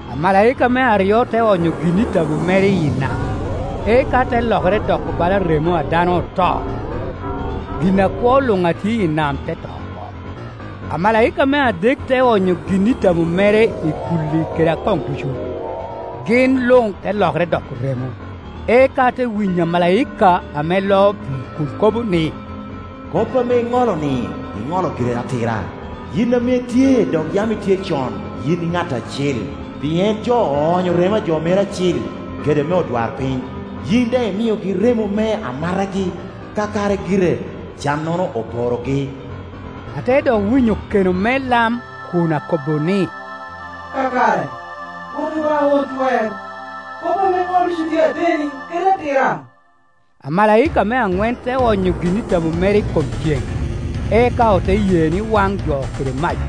Amalaika me aryo te onyo gin a tabo mere iyi nam, eka te lokere doko bala remo a dano oto, gin akwo luŋ a tye i nam te to oko. Amalaika me adek te onyo gin i tabo mere i kulli kede i akoŋ ducu, gin luŋ te lokere doko remo. Eka ate winyo amalaika ame loo pii kun kobo ni, “Kop ame iŋolo-ni iŋolo giri atira, yin ame itye dok yam itye con, yin ŋat Acil; pien jo oonyo remo a jo meri acil, kede me odwarpiny, yin daŋ imiogi remo me amatagi. Kakare gire, cannono oporogi.” Ate dok winyo keno me lam kun akobo ni, “Kakare, Rwot Obaŋa Won Twer, kop ame iŋolo ducu tye ateni kede atira!” Amalaika me aŋwen te onyo gin i tabo mere i kom cen, eka ote ye ni waŋ jo kede mac.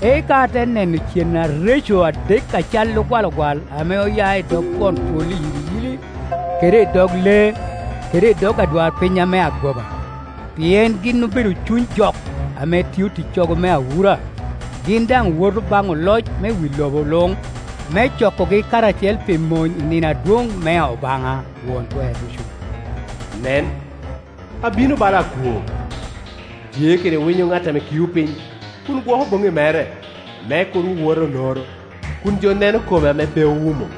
Eka ate neno cen areco adek a calli ogwalogwal ame oya i dog twon twol iyiliyili, kede i dok lee, kede i dog adwarpiny ame agoba, pien gin obedo cuny jok ame tio ticcogo me awura. Gin daŋ woto baŋ oloc me wi lobo luŋ me cokogi karacel pi mony i nino adwoŋ mea Obaŋa Won Twer Ducu. (Nen, abino bala akwo. Tye kede winyo ŋat ame kio piny, kun gwoko boŋŋi mere, me kur wowota onoro, kun jo neno kome ame pe owumo!)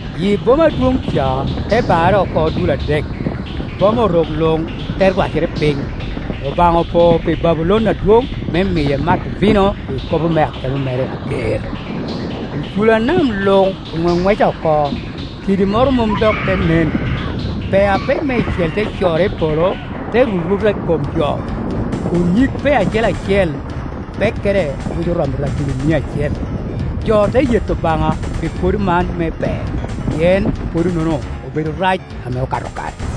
Yi boma adwoŋ ca te barre oko dul adek, boma orok luŋ te rwacere piny. Obaŋa opo pi Babulon adwoŋ me miye mato vino i ikopo me akemo mere ager. Icula nam luŋ oŋweŋweca oko, kidi moro mom dok te nen. Pee apek meicel te corre i polo te ruruta i kom jo, kun nyig pee acel acel pekkere buco romo ratili mia acel, jo te yeto Obaŋa pi pwodo man me pee, pien pwodo-nono obedo rac ame okato kare.